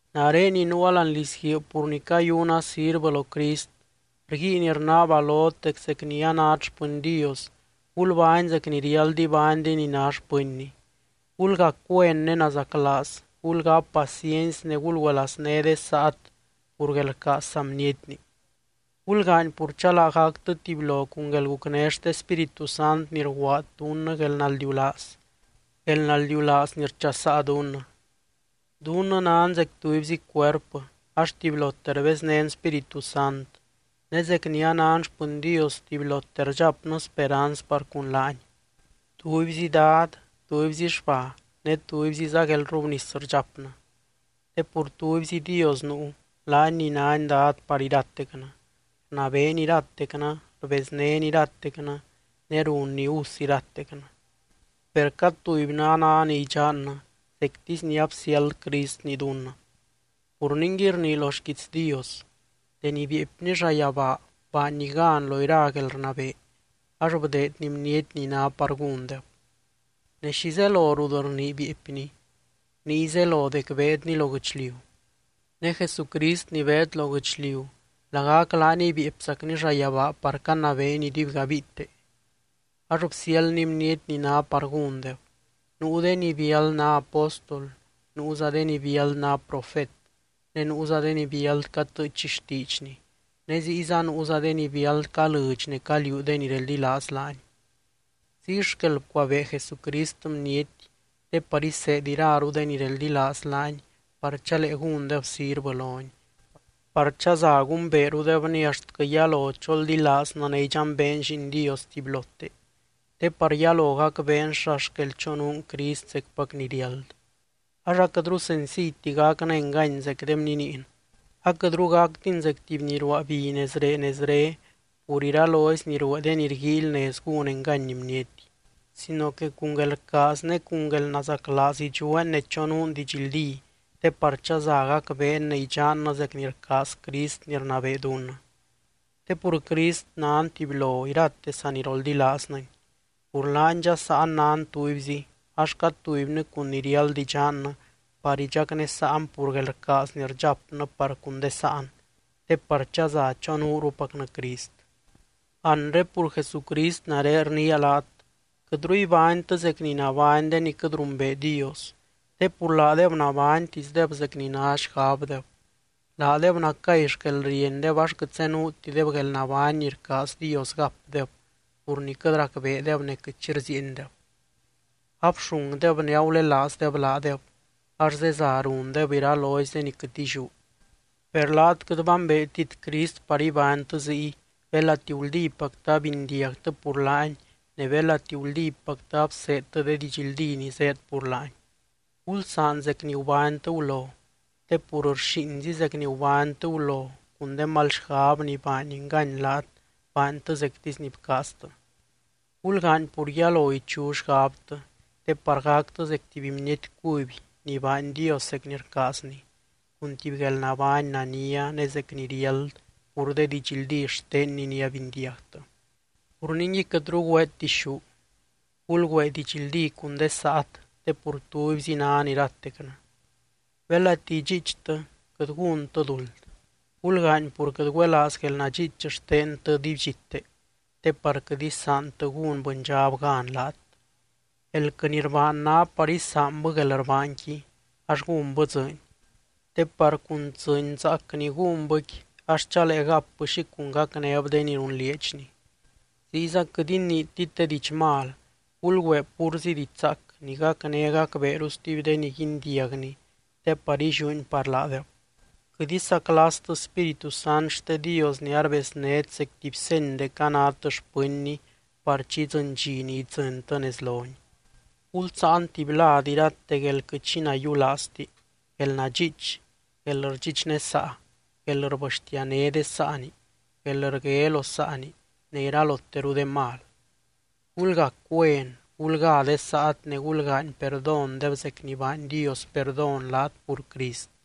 Nare ni nuua láani lizguiib pur ni cayuna sirvɨ lo Crist, rguiin rnaaba lot dec zec ni anát xpɨny Dios, gulbány zec ni riáld ibány de ni ná xpɨnny. Gulgac güen ne nazaclaaz, gulgáp paciency ne gulgüelazné de saat pur guelrcaaz saa bnietni. Gulgaany pur chalaa gactɨ tubylo cun guelgucné xte Spíritu Sant ni rguaad dunnɨ guelnaldiulaaz, guelnaldiulaaz ni rchasaa dunnɨ. Dunnɨ nan zec tubyzi cuerpɨ ax tubylote rbeznén Spíritu Sant ne zec ni anan xpɨny Dios tubylote rdxapnɨ speranz par cun laany. Tubyzi Dad, tubyzi xba ne tubyziza guelrrubnis rdxapnɨ. Te pur tubyzi Dios nuu, laany ni nány Dad par iratecnɨ, rnabeeny iratecnɨ, rbeznény iratecnɨ ne runny us iratecnɨ. Per cad tubynɨ a ná ni idxannɨ, zectisy ni absiáld Cristni dunnɨ. Pur ningui rnii lo xquiits Dios: Deni bieepny llayabaa baanny gan lo ira guelrnabee ax bdeedny bniety ni ná par gúndeb. Ne, ¿xi zelo rut rnii “bieepny”? Niy zelo dec beedny lo guɨchliu. Ne Jesucrist ni beed lo guɨchliu lagac laaniy bieepzacny llayabaa par canabeeny iduibgabiite. Ax bsiáldny bniety ni ná par gúndeb, nuu de ni biáld ná apóstol, nuuza de ni biáld ná profet, ne nuuza de ni biáld catɨɨch xtiidxny, ne ziyza nuuza de ni biáld calɨɨdx ne caliuu de ni reldilaaz laany. Ziy xquel bcuabee Jesucrist bniety te par iseed iraru de ni reldilaaz laany par chalee gúndeb sirvɨ lony, par chaza gumbeerudebny axtquɨ yalo choldilaaznɨ ne idxambeen Lliin Dios tubylote, te par yalo gacbeen xa xquel chonuun Crist zecpac ni riáld. Ax aquɨtru senciyti gacnɨ engany zec de bniniin, aquɨtru gactin zec tuby ni ruaa bi nezree nezre pur iralozy ni ruee de ni rguíily nez gún engany bniety. Sino que cun guelrcaaz ne cun guelnazaclaaz idxueen ne chonuun didxldí te par chaza gacbeen ne idxannɨ zec ni rcaaz Crist ni rnabee dunnɨ. Te pur Crist nan tubylo irate saniroldilaaznɨny, pur laany dxasaan nan tubyzi, ax cad tubynɨ cun ni riáld idxannɨ par idxacnesaan pur guelrcaaz ni rdxapnɨ par cun de sáan, te par chaza chonuurupacnɨ Crist. Anre pur Jesucrist nare rniia laat: quɨtru ibánytɨ zec ni nabány de ni quɨt rumbee Dios, te pur laadeb nabánytisdeb zec ni ná xgabdeb. Laadeb nacay xquelriendeb ax quɨt zenuutideb guelnabány ni rcaaz Dios gapdeb pur ni quɨt racbeedeb ne quɨt xi rziiendeb. Abxungdeb ne agulelaazdeb laadeb ax zeza rundeb iralozy de ni quɨt illiú. Per laat quɨt bambeetit Crist par ibánytɨ ziy, belati guldípactɨ abindiagtɨ pur laany ne belati guldípactɨ abseedtɨ de didxldí ni zéed pur laany. Gulsaan zec ni gubánytɨ gulo, te pur rxíinzi zec ni gubánytɨ gulo cun de mal xgab ni baany engany laat baantɨ zectisy ni bcaaztɨ. Gulgaany pur yalo ichu xgabtɨ te par gactɨ zec tuby bniety cuby ni baany Dios zec ni rcaazny, cun tuby guelnabány nania ne zec ni riáld pur de didxldí xtenny ni abindiagtɨ. Pur ningui, quɨtru güeet dixú. Gulgüee didxldí cun de saat te pur tubyzi nan iratecnɨ. Belati idxiichtɨ, quɨt gúntɨ duld. Gulgaany pur quɨt güelaaz guelnadxiich xtentɨ dibydxite te par quɨt isaantɨ gún bɨndxab gan laat. Elquɨ ni rbaan ná par isaanbɨ guelrbaanqui ax gúnbɨ dzɨɨny, te par cun dzɨɨny zaac ni gúnbɨqui ax chalee gapbɨ xi cun gacnéb de ni runlieedxni. Ziyza quɨt iniitit de diidx mal, gulgüee púrzi diidx zaac ni gacné gacbeeru stuby de ni guindiagni te par illiúni par laadeb. Quɨt isaclastɨ Spíritu Sant xte Dios ni arbeznét zec tuby seny dec anát xpɨnny par chi idzɨny dxi ni idzɨntɨ nez lony. Gulsáan tuby lad irate guél quɨt xi nayiulaazti, guelnadxiich, guelrdxichnesaa, guelrbɨxtiané de saani, guelrgue lo saani ne iraloteru de mal. Gulgac güen, gulgá de saat ne gulgaany perdóndeb zec ni baany Dios perdón laat pur Crist.